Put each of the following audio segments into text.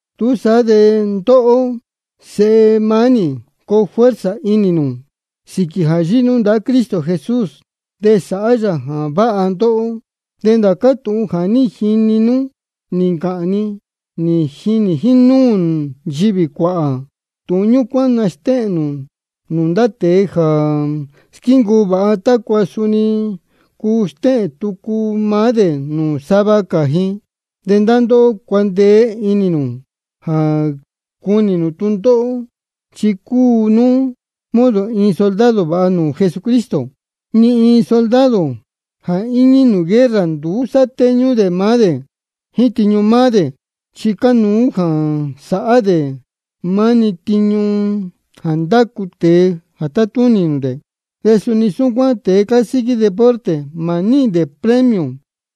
Túsaá de ndóhó, sēhe mánī, coo fuerza inī nū sīquī jā yíhí nú ndahá Cristo Jesús de sáhá yā jā váha ndóhó. De ndācá tūhun jā ní jini nú nī ncāhān ni, nī jinī jínúū nchivī cuāhā, tūhun ñúcuán nastéhēn nū nūū ndá tēe jā squíncuu vāha, tácua suni cuu stéhēn tucu maá dē nūū sava cā ji. De ndóhó cuandeé inī nū jā cunī nū tūndóhó, chi cúu nú modo iin soldado vāha nūū Jesucristo. Ni iin soldado jā íñí nūū guerra, nduú sátéñú dē maá dē jíín tiñu maá dē, chi cánuú jā sāhá dē maá-ni tiñu jā ndácu tēe jā tátúnī nūū dē. De suni súcuán tēe cásíquí deporte, mā níhīn dē premio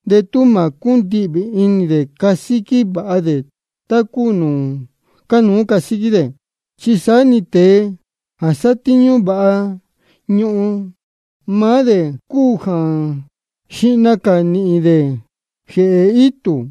de tú mā cúndihvī inī dē jā casíquí vāha dē tá cúu nūū cánuú casíquí dē. De saá-ni tēe jā sátíñú vāha ñuhun, maá dē cúu jā xihna cā nīhīn jā jéhe itū.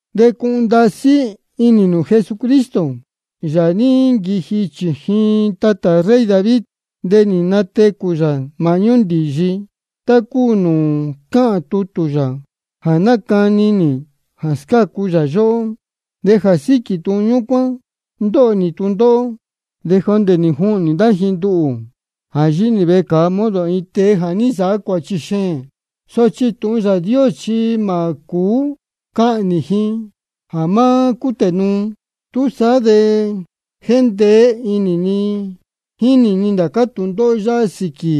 De cuhun ndasí inī nū Jesucristo, Yāā jā ní nquiji chījin tatā rey David, de nī natecū yā māhñú ndīyi, tá cúu nūū cáhān tūhun yā jā nácani nī jā scácu yā yóhó. De jā síquī tūhun ñúcuán ndóho nī tūndóhó, de jondē nī juhnī ndá ji nduhū jā yíhí nī vecāa, modo iin tēe jā ní nsāhá cuāchi xēēn. Sochi tūhun Yāā Dios chi mā cūú cuhnī ji jā má cútē nuu. Túsaá de jéndeé inī ni jínī ni ndācá tūndóhó yáhá sīquī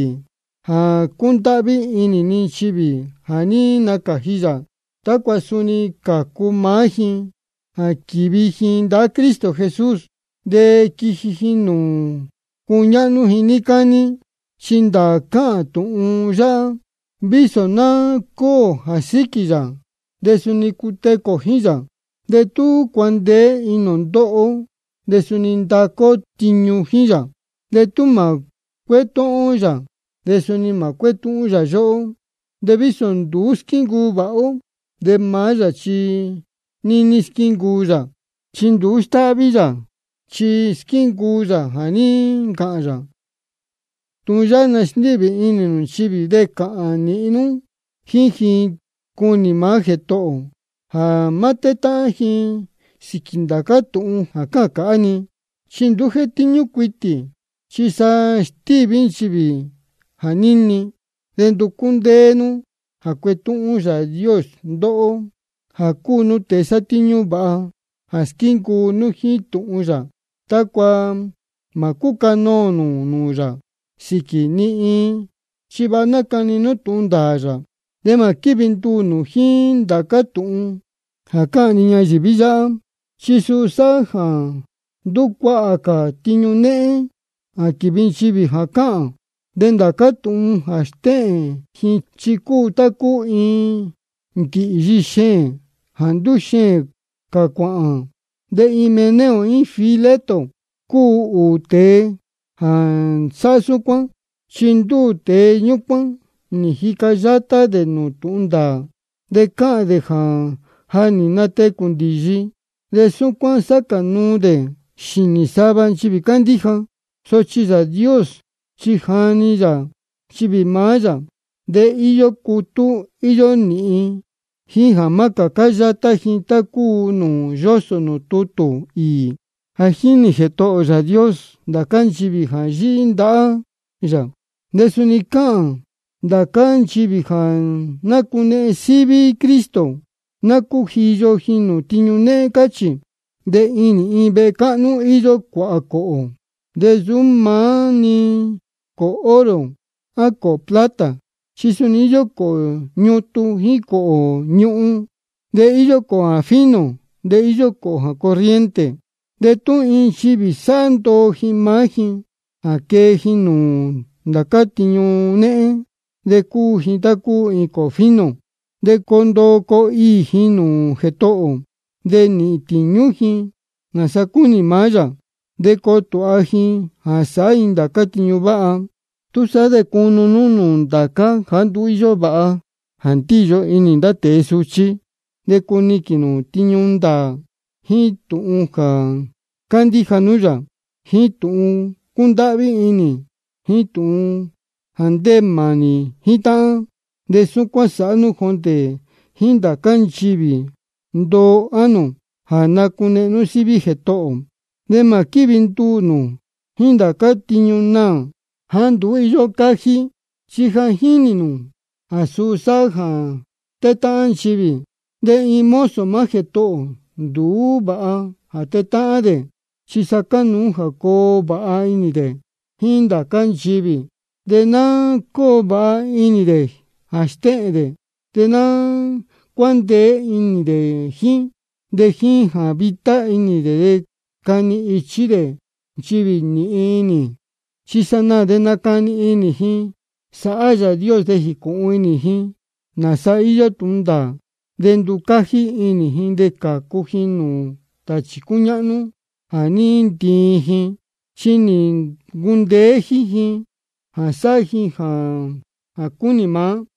jā cúndáhví inī ni nchivī jā ní nacāji yā, tácua suni cācu maá ji jā quīvi ji ndahá Cristo Jesús, de quīhīn ji nūū cuñáhnú ji níí cání. Chi ndāā cáhān tūhun yáhá: Vísō ná cúū ō jā síquī yā, de suni cutecū ō jíín yā, de tú cuandeé inī ō ndoho ó, de suni ndacu ó tiñu jíín yā. De tú mā cuétúhún ó yā, de suni mā cuétúhún yā yóhó. De vísō nduú squíncuu vāha ó, de maá yā chi níní squíncuu yā, chi nduú cúu sāhá falta yā, chi squíncuu yā jā ní ncāhān yā. Tūhun yáhá nasndíhvī inī nū nchivī, de cāhān nīhin nú jíín ji, cunī maá Jētohō ō, jā má tétáhán ji sīquī ndācá tūhun jā cáhān cāhá-ni. Chi nduú jétíñú cuitī, chi sa stíví nchivī jā níni. De nducú ndéé nú jā cuetúhún Yāā Dios ndóhó, jā cúu nú tēe sátíñú vāha jā squíncuu jíín tūhun yā, tácua mā cúcanoō nū nūū yā sīquī ni iin, chi vāha nacani nú tūhun ndāā yā. De mā quívi nduū nū jíín ndācá tūhun cāhá-ni ñayīví yáhá, chi suu sáhá jā ndúcuahā cā tiñu néhén jā quívi ndá nchivī jā cáhān. De ndācá tūhun jā stéhēn ji chi cúu tá cúu iin ndīhyi xēēn jā ndúxeēn cā cuāhān. De Himeneo jíín Fileto cúu ūū tēe jā sáhá súcuán. Chi ndúū tēe ñúcuán nī jica yátá dē nūū tūhun ndāā, de cáhān dē jā ja nī natecū ndīyi. De súcuán sáca nuu dē xīnī sava nchivī cándíja. Sochi Yāā Dios nī jani yā nchivī maá yā, de íyó cutú íyó nīhin ji jā má cācá yátá ji, tá cúu nūū yósō nūū tutū īī: Ja jínī Jētohō ō Yāā Dios ndācá nchivī jā yíhí ndahá yā. De suni cáhān: Ndācá nchivī jā nácunehen síví Cristo, ná cújiyo ji nūū tiñu néhén, cáchī. De inī iin vehe cáhnú íyó cuāhā cōhō, de nsūú maá-ni cōhō oro jíín cōhō plata, chi suni cōhō ñutun jíín cōhō ñuhun. De íyó jā fino de íyó jā corriente. De tú iin nchivī sāhá ndoo ji maá ji jā quee ji nūū ndācá tiñu néhén, de cuu ji tá cúu iin cōhō fino. De coo ndoo coo iī ji nūū Jētohō ō, de nīhīn tīñú ji nāsa cúnī maá yā. De coo tūha ji jā sāhá ji ndācá tiñu váha. Túsaá de cunu nú nūū ndācá jāá nduú vāha jā ndíyo inī ndá tēe suchí. De cuniquīn nū tiñu ndāā, jíín tūhun jā cándíja nú yā, jíín tūhun cúndáhví inī, jíín tūhun jā ndéē mānī jíín táhán. De súcuán sāhá nú jondē jíín ndācá nchivī ndoo ánō jā nácunehen síví maá Jētohō ō. De mā quívi nduū nū jíín ndācá tūhun naā jāá nduú íyó cájí, chi ja jínī nū jā suu sáhá jā tétáhán nchivī. De iin mozo maá Jētohō ō, nduú vāha jā tetáhán dē, chi sa cánuú jā coo vāha inī dē jíín ndācá nchivī. De ná cóo vāha inī dē jā stéhēn dē, de ná cuándeé inī dē jíín ji. De jíín jā vitá inī dē de cani ichí dē nchivī nīhin inī. Chi sanaā de nacani inī ji sāhá Yāā Dios, de jīcūhun inī ji nāsa íyó tūhun ndāā. De nducájí inī ji de cācu ji nūū tāchī cúñáhnú jā ní ntiin ji, chi nī ncundeé jíín ji jā sáhá ji jā cúnī maá.